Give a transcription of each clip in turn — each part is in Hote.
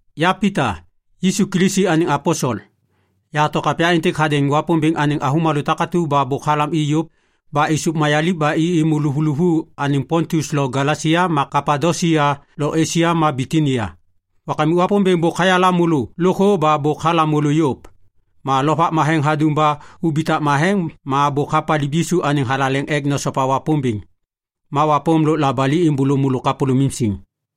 Ya Pita, Yisu Kilisi anêŋ aposel, yahato kapya êntêk hadêŋ Wapômbêŋ anêŋ avômalô takatu ba bôk halam i yôv ba êsôv mayaliv ba i êmô loŋ luvuluvu anêŋ Pontus lo Galesia ma Kapadosia lo Esia ma Bitinia. Wakamik Wapômbêŋ bôk hayala môlô lôkthô ba bôk halam môlô yôv. Ma Lovak Matheŋ hadum ba ubitak matheŋ ma bôk hapaliv Yisu anêŋ thalaleŋ ek nosopa Wapômbêŋ. Ma wapôm lôk labali êmbôlô môlô kapôlômim siŋ.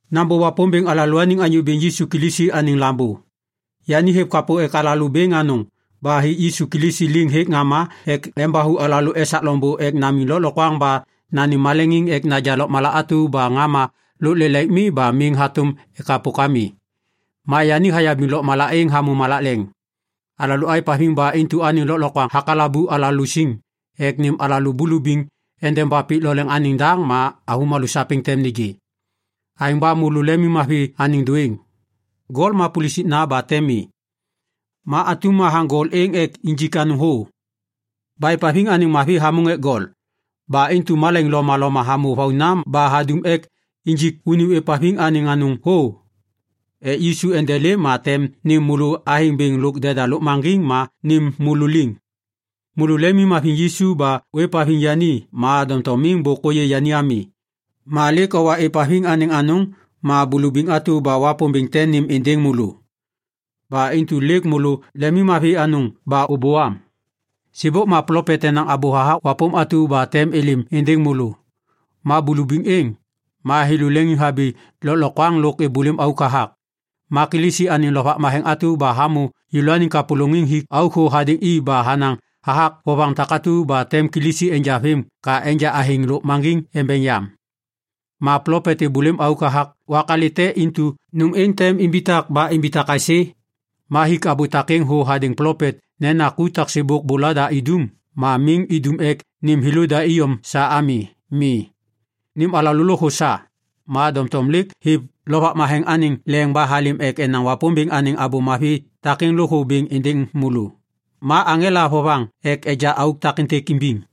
Nambô Wapômbêŋ alalôaniŋ Anyô Bêŋ Yisu Kilisi anêŋ Lambô Wapômbêŋ. Yani hêv kapô ek alalô bêŋ anôŋ ba hik Yisu Kilisi liŋ hêk ŋama ek embathu alalô esak loŋbô ek namiŋ lôklokwaŋ ba nanêm maleŋiŋ ek naja lôkmala atu ba ŋama lôk lelaik mi ba miŋ hatôm ekapok ami. Ma yani hayabiŋ lôkmala êŋ hamô malak leŋ. Alalô aêvhaviŋ ba intu anêŋ lôklokwaŋ hakalabu alalô siŋ ek nêm alalô bulubiŋ endeba pik lo leŋ anêŋ daŋ ma avômalô sapêŋ tem nêgê. Aêŋ ba môlô lemimmavi anêŋ dôêŋ. Gol ma pulusikna ba tem mi. Ma atum hathaŋ gol êŋ ek injik anôŋ thô. Ba êvhaviŋ anêŋ mavi hamôŋ ek gol. Ba intu malaiŋ lomaloma hamô vauna ba hadum ek injik unim ôêvhaviŋ anêŋ anôŋ thô ek Yisu endelêm ma tem nêm môlô athêŋ bêŋ lôk deda lôkmaŋgiŋ ma nêm môlô liŋ. Môlô lemimhaviŋ Yisu ba ôêvhaviŋ yani ma doŋtom miŋ bôk ôyê yani ami. Ma lêk owa êvhaviŋ anêŋ anôŋ ma bulubiŋ atu ba Wapômbêŋ tem nêm êndêŋ môlô. Ba intu lêk môlô lemimmavi anôŋ ba ôbôam. Sêbôk ma plopet enaŋ abô hathak wapôm atu ba tem êlêm êndêŋ môlô. Ma bulubiŋ êŋ, ma thêlô leŋiŋhabi lôklokwaŋ lôk êbôlêm auk hathak. Ma Kilisi anêŋ Lovak Matheŋ atu ba hamô thêlôniŋ kapôlôŋiŋ hik auk thô hadêŋ i ba hanaŋ hathak vovaŋ takatu ba tem Kilisi enja vêm ka enja athêŋ lôkmaŋgiŋ embeŋ yam. Ma plopet êbôlêm auk hathak wak alête intu nôm êŋ tem imbitak ba imbitak aisê? Ma hik abô takêŋ thô hadêŋ plopet nena ku taksêbôk bôlada idum ma miŋ idum ek nêm thêlôda iyom sa ami. Mi. Nêm alalô lôkthô sa. Ma doŋtom lêk hêv Lovak Matheŋ anêŋ leŋ ba halêm ek enaŋ Wapômbêŋ anêŋ Abô Mavi takêŋ lôkthô bêŋ êndêŋ môlô. Ma aŋela vovaŋ ek neja auk takêntêk imbiŋ.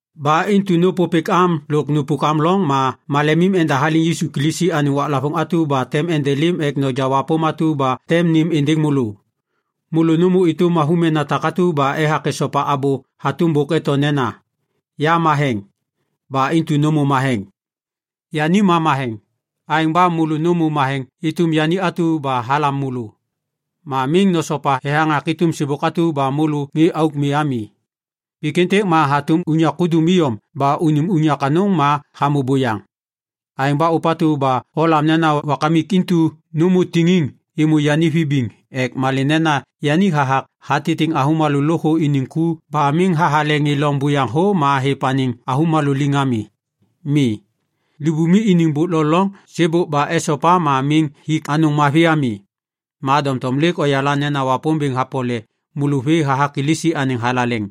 Ba intu nôpôpêk am lôk nupuk am loŋ ma malem endahaliŋ Yisu Kilisi anêŋ waklavôŋ atu ba tem endelêm ek noja wapôm atu ba tem nêm êndêŋ môlô. Môlô nômô êtôm avômena takatu ba ethak esopa abô hatôm bôk eto nena, “Ya matheŋ. Ba intu nômô matheŋ.” Yani ma matheŋ. Aêŋ ba môlô nômô matheŋ êtôm yani atu ba halam môlô. Ma miŋ nosopa thethaŋak êtôm sêbôk atu ba môlô ŋê auk mi ami. Pik êntêk ma hatôm unyak kudum iyom ba unim unyak anôŋ ma hamô buyaŋ. Aêŋ ba ôpatu ba olam nena Wakamik intu nômô tiŋiŋ êmô yani vibiŋ ek malê nena yani hathak hatitiŋ avômalô lôkthô iniŋ ku ba miŋ hathale ŋê loŋ buyaŋ thô ma hêv anêŋ avômalô liŋ ami. Mi. Libumi iniŋ bôk lo loŋ sêbôk ba esopa ma miŋ hik anôŋ mavi ami. Ma doŋtom lêk oyala nena Wapômbêŋ hapole môlô vê hathak Kilisi anêŋ thalaleŋ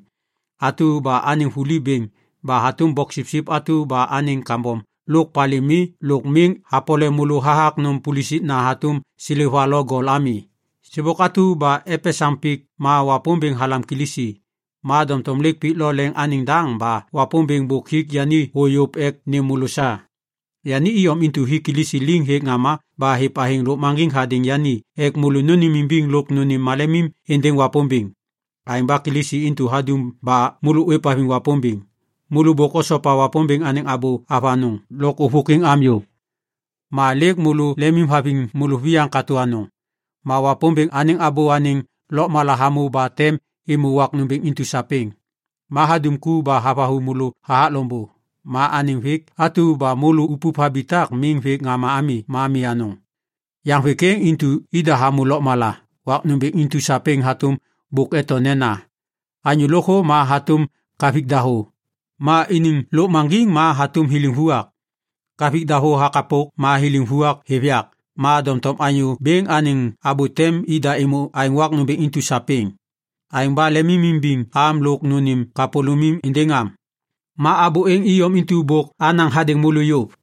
atu ba anêŋ vuli bêŋ ba hatôm boksipsip atu ba anêŋ kambom lo palê mi lôk miŋ hapole môlô hathak nôm pulusikna hatôm seleva lo gol ami. Sêbôk atu ba epesaŋ pik ma Wapômbêŋ halam Kilisi. Ma doŋtom lêk pik lo leŋ anêŋ daŋ ba Wapômbêŋ bôk hik yani thô yôv ek nêm môlô sa. Yani iyom intu hik Kilisi liŋ hêk ŋama ba hêv athêŋ lôkmaŋgiŋ hadêŋ yani ek môlô nônêmimbiŋ lôk nônêm malemim êndêŋ Wapômbêŋ. Aêŋ ba Kilisi intu hadum ba môlô ôêvhaviŋ Wapômbêŋ. Môlô bôk osopa Wapômbêŋ anêŋ abô avanôŋ lôk ôvôkwiŋ am yôv. Ma lêk môlô lemimhaviŋ môlôviyaŋ katô anôŋ. Ma Wapômbêŋ anêŋ abô anêŋ lôkmala hamô ba tem êmô wak nômbêŋ intu sapêŋ. Ma hadum ku ba havathu môlô hathak loŋbô. Ma anêŋ vêk atu ba môlô upup habitak miŋ vêk ŋama ami ma mi anôŋ. Yaŋ vêk êŋ intu ida hamô lôkmala wak nômbêŋ intu sapêŋ hatôm bôk eto nena, “Anyô lôkthô ma hatôm kavik dahô, ma iniŋ lôkmaŋgiŋ ma hatôm thiliŋ vuak; kavik dahô hakapok ma thiliŋ vuak êv yak ma doŋtom Anyô Bêŋ anêŋ abô tem ida êmô aêŋ wak nômbêŋ intu sapêŋ.” Aêŋ ba lemimimbiŋ am lôk nônêm kapôlômim êndêŋ am. Ma abô êŋ iyom intu bôk anaŋ hadêŋ môlô yôv.